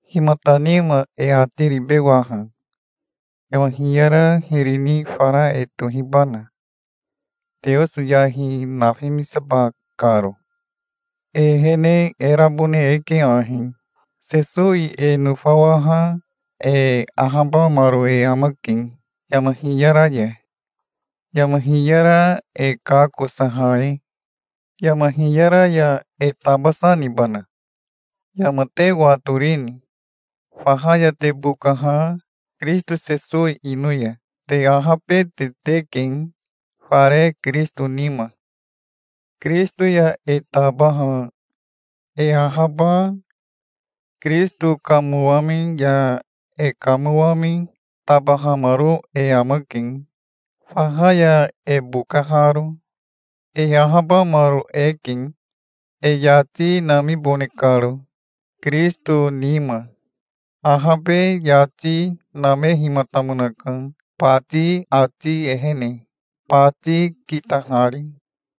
Himata nima e ati ribe waha? Yama hiyara hiri ni fara e tohibana, Teoso yahi nafimisaba karo? E ehene e rabone eke ahi. Sesowi e nofawaha e ahabamaro e amake yama hiyara ya, yama hiyara e kakosaha e. Yama hiyara ya e tabasa nibana? Yama te watorini? Faha ya te bokaha Kirisito Sesowi ino ya, te ahabete teke, fare Kirisito nima. Kirisito ya e tabaha e ahaba Kirisito kamowami ya e kamowami tabahamaro e amake, faha ya e bokaharo. E ahabamaro eke, e yati namibone karo, Kirisito nima. Ahabe yati namehimatamonaka, bati ati ehene, bati kitahari.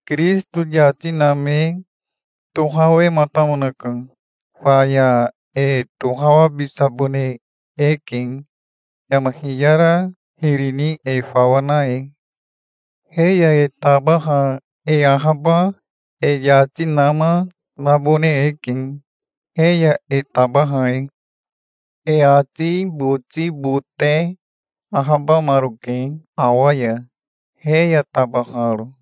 Kirisito yati name tohawematamonaka. Faya e tohawabisabone eke yama hiyara hiri ni e fawa na e. He ya e taba e ahaba, e yati nama nabone eke, he ya e tabaha e. E ati boti bote ahabamaroke awa ya, he ya tabaharo,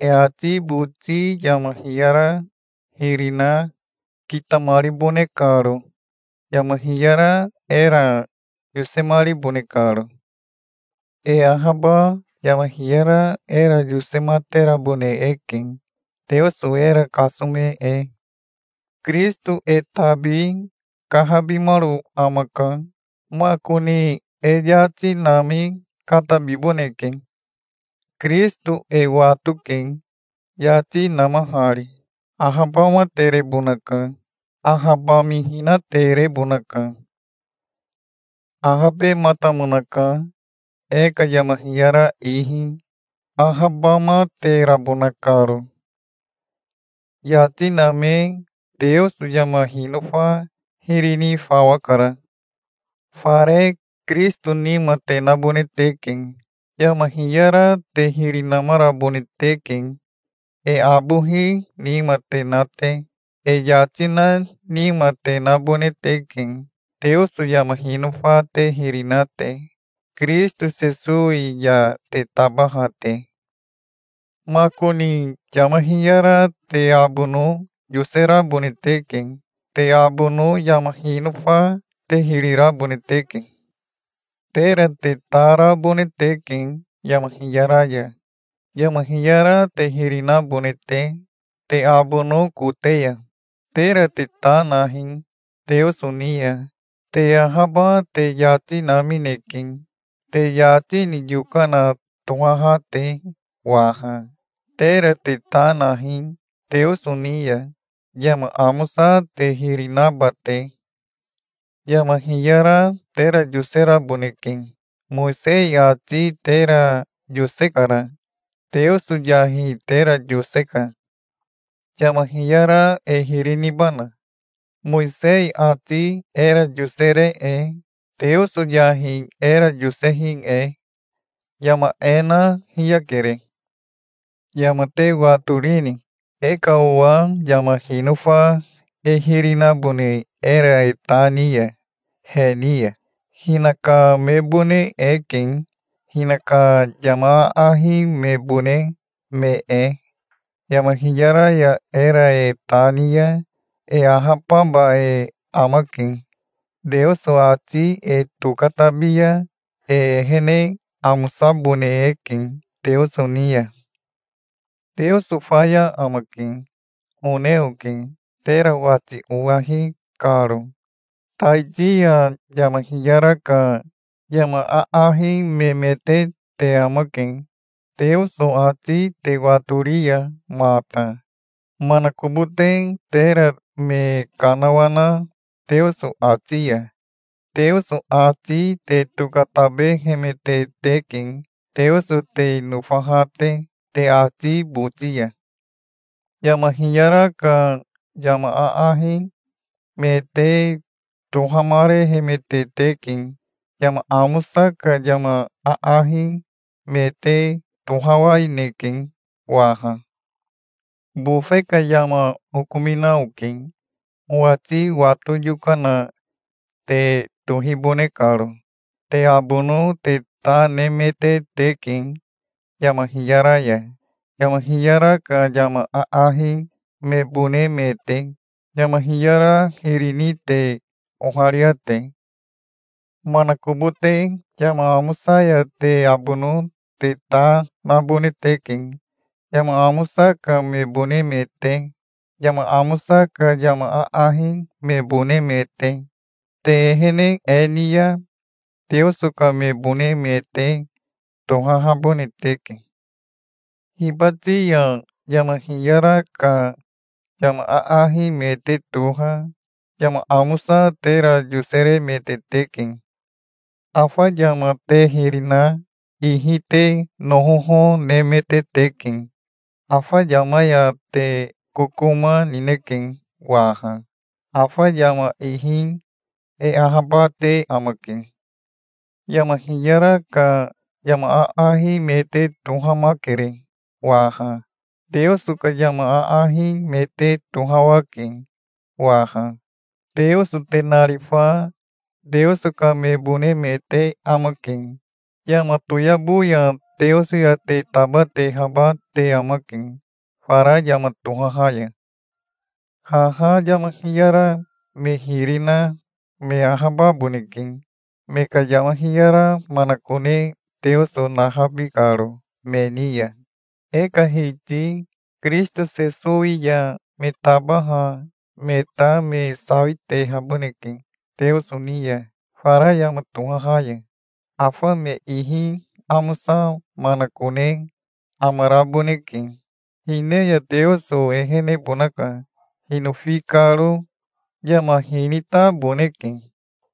e ati boti yama hiyara hiri na kitamaribone karo, yama hiyara era yosemaribone karo. E ahaba yama hiyara era yosematerabone eke, Teoso era kasome e. Kirisito e tabi kahabimaro amaka. Makoni e yati nami katabiboneke. Kirisito e watoke, yati namahari. Ahabamaterebonaka. Ahabamihinaterebonaka. Ahabematamonaka e ka yama hiyara ihi, ahabamaterabona karo. Yati name Teoso yama hinofa hiri ni fawa kara. Fare Kirisito nima te nabone teke. Yama hiyara te hiri namarabone teke, e abohi nima te na te. E yati na nima te nabone teke, Teoso yama hinofa te hiri na te, Kirisito Sesowi ya te tabaha te. Makoni yama hiyara te abono yoserabone teke. Te abono yama hinofa te hiri rabone teke. Tera te ta rabone teke yama hiyara ya, yama hiyara te hiri nabone te, te abono kote ya. Tera te ta nahi Teoso ni ya. Te ahaba te yati namineke, te yati ni yokana tohaha te waha. Tera te ta nahi Teoso ni ya, yama amosa te hiri naba te. Yama hiyara tera yoseraboneke. Mowisei ati tera yosekara. Teoso yahi tera yoseka. Yama hiyara e hiri nibana, Mowisei ati era yosere e, Teoso yahi era yosehi e? Yama e na hiyakere. Yama te watorini? E ka owa yama hinofa e hiri nabone era e ta ni ya he ni ya, hinaka mebone eke, hinaka yama aahi mebone me e. Yama hiyara ya era e ta ni ya e ahababa e amake. Teoso ati e tokatabi ya e ehene amosabone eke Teoso ni ya. Teoso faya amake, one oke, tera wati owahi karo. Taiti ya yama hiyara ka yama aahi memete te amake, Teoso ati te watori ya mata. Manakobote tera me kanawana Teoso ati ya, Teoso ati te tokatabehemete teke, Teoso te nofaha te, te ati boti ya. Yama hiyara ka yama aahi me te tohamarehemete teke. Yama amosa ka yama aahi me te tohawaineke waha. Bofe ka yama okomina oke, owati wato yokana te tohibone karo. Te abono te ta nemete teke yama hiyara ya, yama hiyara ka yama aahi mebone me te, yama hiyara hiri ni te oharia te. Manakobote yama amosa ya te abono te ta nabone teke, yama amosa ka mebone me te, yama amosa ka yama aahi mebone me te. Te ehene e ni ya Teoso ka mebone me te tohahabone teke. Hibati ya yama hiyara ka yama aahi me te toha yama amosa tera yoseremete teke. Afa yama te hiri na ihi te nohoho nemete teke. Afa yama ya te kokoma nineke waha. Afa yama ihi e ahabate amake. Yama hiyara ka yama aahi me te tohamakere waha. Teoso ka yama aahi me te tohawake waha. Teoso te narifa Teoso ka mebone me te amake. Yama toyabo ya Teoso ya te tabatehaba te amake fara yama tohaha ya. Haha yama hiyara me hiri na me ahababoneke, me ka yama hiyara manakone Teoso nahabi karo me ni ya. E ka Hiti Kirisito Sesowi ya me tabaha me ta me sawitehaboneke Teoso ni ya fara yama tohaha ya. Afa me ihi amosa manakone amaraboneke. Hine ya Teoso ehenebonaka, hinofi karo. Yama hinitaboneke.